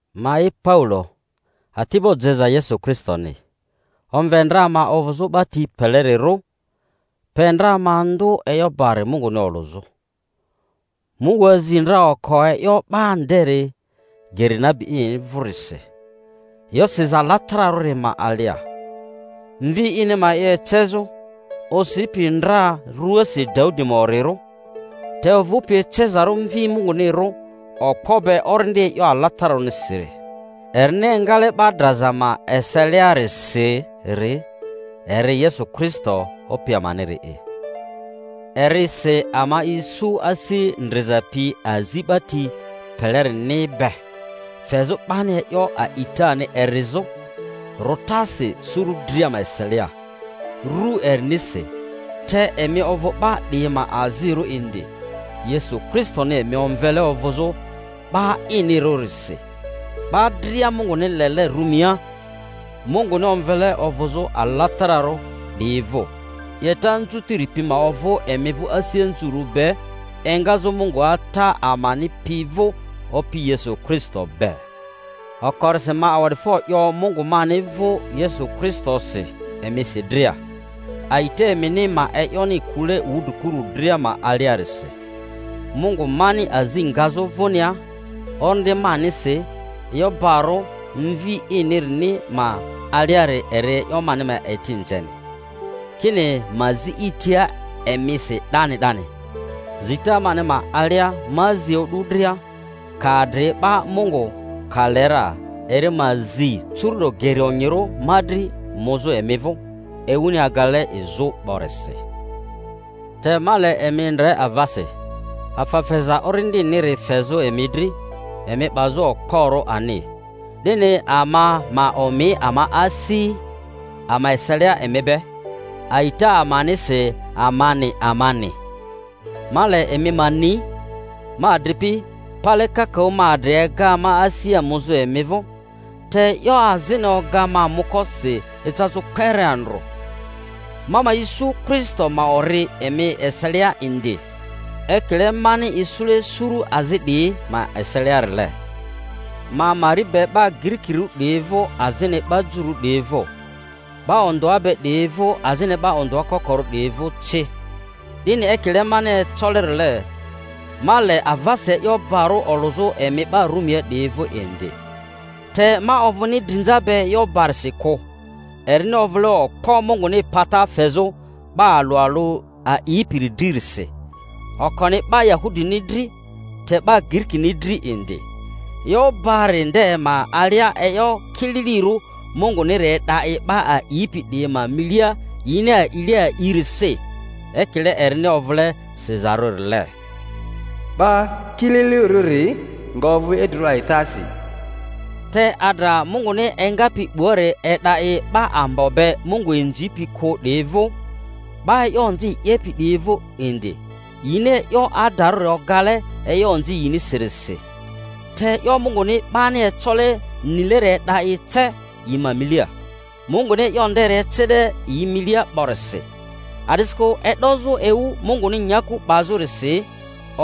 Ma'i Paulo, ati'bo jeza Yesu Kristoni. Omve ndra ma ovᴜzᴜ 'ba ti pelerirᴜ, pe ndra ma ndᴜ e'yo bari Munguni olᴜzᴜ. Mungu azi ndra oko e'yo ba nderi geri nabi ini vᴜrisi, e'yo siza alatararᴜri ma alia, Mvi ini ma e'yo ecezᴜ, osipi ndra ruasi Daudi ma orirᴜ te ovᴜpi ecezarᴜ Mvi Mungunirᴜ okpo be Orindi e'yo alatararᴜnirisi, erini engale 'ba draza ma eseliarisiri. Eri Yesu Kristo, Opi amaniri'i. Erisi ama isu asi ndriza pi azi 'ba ti pelerini be, fezᴜ 'bani e'yo a'itani erizᴜ rᴜtasi suru dria ma eselia, ru erinisi. Te emi ovᴜ 'ba 'diyi ma azirᴜ indi, Yesu Kristoni emi omvele ovᴜzᴜ 'ba inirᴜrisi. 'Ba dria Munguni lele Rumia, Munguni omvele ovᴜzᴜ alatararᴜ 'diyi vᴜ: 'Yeta anzutiri pi ma ovᴜ emi vᴜ asi anzurᴜ be engazᴜ Mungu Ata amani pi vᴜ Opi Yesu Kristo be. Okorisi ma awa'difo 'yo Mungu mani vᴜ Yesu Kristosi emisi dria, a'ita emini ma e'yoni kule wudrikuru dria ma aliarisi. Mungu mani azi ngazᴜ vᴜnia orindi manisi e'yo barᴜ Mvi inirini ma aliari eri e'yo mani ma eti nzeni, kini ma zi i tia emisi 'dani 'dani. Zita mani ma alia ma zi o'du dria, ka adri ba, Mungu ka le ra, eri ma zi euru'do geri onyirᴜ ma dri muzᴜ emi vᴜ, ewuni agale izᴜ 'borisi. Te ma le emi ndre avasi, afa feza orindiniri fezᴜ emi dri emi 'bazᴜ okporᴜ ani, 'dini ama ma omi ama asi ama eselia emi be, a'ita amanisi amani amani. Ma le emi ma ni, ma adripi, pale kakaᴜ ma adri ega ma asia muzᴜ emi vᴜ (te e'yo azini oga ma muko si ecazᴜ kpere andrᴜ), ma ma isu Kristo ma ori emi eselia indi, ekile mani isule suru azi 'diyi ma eseliarile. Ma mari be 'ba Girikirᴜ 'diyi vᴜ azini 'ba jururᴜ 'diyi vᴜ, 'ba ondᴜa be 'diyi vᴜ azini 'ba ondᴜa kokorᴜ 'diyi vᴜ ci: 'dini ekile mani ecolerile, ma le avasi e'yo bari olᴜzᴜ emi 'ba Rumia 'diyi vᴜ indi. Te ma ovᴜni drinza be e'yo barisi kᴜ: erini ovᴜle okpo Munguni pata fezᴜ 'ba alᴜ alᴜ a'ipiri dririsi, okoni 'ba Yahudini dri, te 'ba Girikini dri indi. E'yo bari nde ma alia e'yo kililirᴜ Munguniri e'da i 'ba a'ipi 'diyi ma milia yini a'ile a'irisi; ekile erini ovᴜle sizarᴜrile, 'Ba kililirᴜri nga ovᴜ idrirᴜ a'itasi. Te adra Munguni engapi 'buari e'da i 'ba ambo be Mungu inzipi kᴜ 'diyi vᴜ, 'ba e'yo onzi 'yepi 'diyi vᴜ indi, yini e'yo adarᴜri ogale e'yo onzi yinisirisi. Te e'yo Munguni 'bani ecole nileri e'da i ce yi ma milia, Munguni e'yo nderi ecele yi milia 'borisi. A'disikᴜ e'dozᴜ ewu Munguni nyaku 'bazᴜrisi,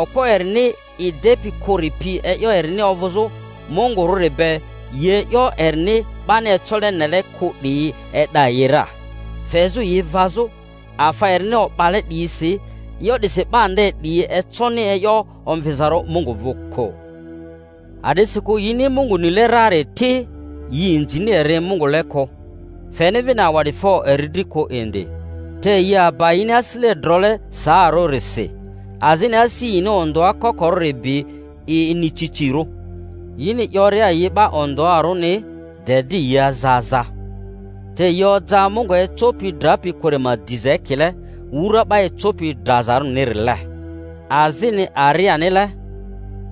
okpo erini i depi kᴜri pi e'yo erini ovᴜzᴜ Mungurᴜri be, yi e'yo erini 'bani ecole nele kᴜ 'diyi, e'da yi ra, fezᴜ yi vazᴜ afa erini o'bale 'diyisi. E'yo 'disi 'ba nde 'diyi econi e'yo omvizarᴜ Mungu vᴜ kᴜ; a'disikᴜ yini Mungu nile rari ti, yi inzini eri Mungule kᴜ, feni vini awa'difo eri dri kᴜ indi, te yi aba yini asisile drole saarᴜrisi azini asi yini ondᴜa kokorᴜri bi i inieicirᴜ. Yini 'yoria yi 'ba ondᴜarᴜni de di yi aza aza, te yi oja Mungu ecopi drapi kᴜri ma diza ekile wura 'ba ecopi drazarᴜrinile, azini arianile,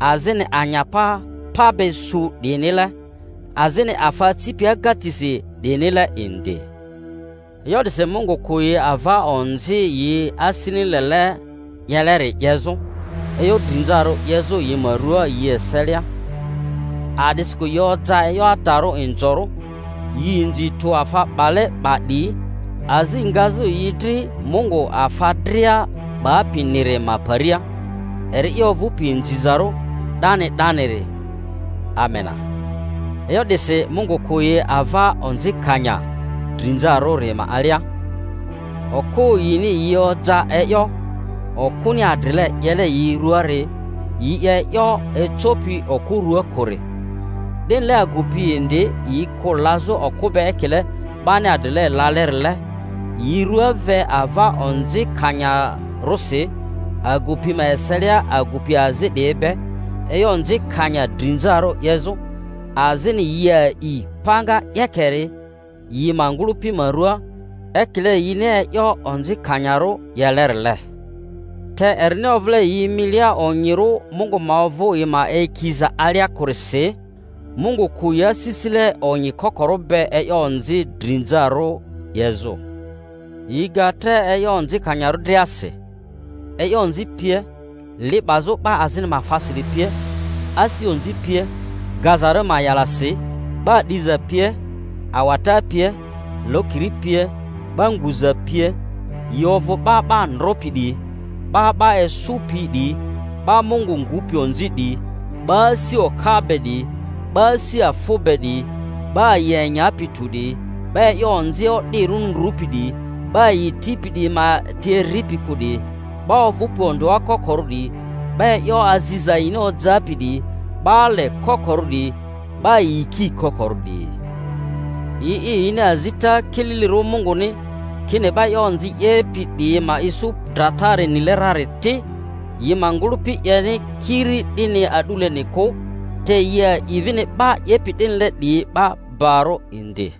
azini anyapa pa be su 'diyinile, azini afa acipi agatisi 'diyinile indi. E'yo 'disi Mungu kᴜ yi ava onzi yi asini lele 'yeleri 'yezᴜ, e'yo drinzarᴜ 'yezᴜ yi ma ruaa yi eselia, a'disikᴜ yi oja e'yo adarᴜ inzorᴜ, yi inzi tᴜ afa 'bale 'ba 'diyi, azi ngazᴜ yi dri Mungu afa dria 'bapiniri ma paria, eri'i ovᴜpi inzizarᴜ 'dani 'daniri! Amena. E'yo 'disi Mungu kᴜ yi ava onzikanya drinzarᴜri ma alia. Okᴜ yini yi oja e'yo okᴜni adrile 'yele yi ruaari, yi 'ye e'yo ecopi okᴜ ruaa kᴜri. 'Dinile agupi indi yi kᴜ lazᴜ okᴜ be ekile 'bani adrile lalerile, yi rua ve ava onzikanyarosi agupi ma eselia agupi azi 'diyi be e'yo onzikanya drinzarᴜ 'yezᴜ, azini yi a'i panga 'yekeri yi ma ngᴜlᴜpi ma ruaa ekile yini e'yo onzikanyarᴜ 'yelerile. Te erini ovᴜle yi milia onyirᴜ Mungu ma ovᴜ yi ma eyikiza alia kᴜrisi, Mungu kᴜ yi asisile onyi kokori be e'yo onzi drinzarᴜri 'yezᴜ. Yi ga tre e'yo onzikanyarᴜ driasi, e'yo onzi pie, li 'bazᴜ 'ba azini ma afasiri pie, asi onzi pie. Gazarᴜ ma'yalasi, 'ba 'diza pie, awata pie, lokiri pie, 'ba nguza pie, yi ovᴜ 'ba 'ba ndropi 'diyi, 'ba 'ba esᴜpi 'diyi, 'ba Mungu ngupi onzi 'diyi, 'ba asi oka be 'diyi, 'ba asi afᴜ be 'diyi, 'ba yi enyapi tᴜ 'diyi, 'ba e'yo onzi o'dirᴜ ndrupi 'diyi, 'ba yi tipi 'diyi ma ti eripi kᴜ 'diyi, 'ba ovᴜpi ondᴜa kokorᴜ 'diyi, 'ba e'yo aziza yini ojapi 'diyi, 'ba ale kokorᴜ 'diyi, 'ba yiki kokorᴜ 'diyi. Yi'i yini azita kililirᴜ Munguni, kini 'ba e'yo onzi 'diyi 'yepi 'diyi ma isu dratari nile rari ti, yi ma ngᴜlᴜpi 'yeni kiri 'dini a'duleni kᴜ, te yi a'i vini 'ba 'yepi 'dinile 'diyi barᴜ indi.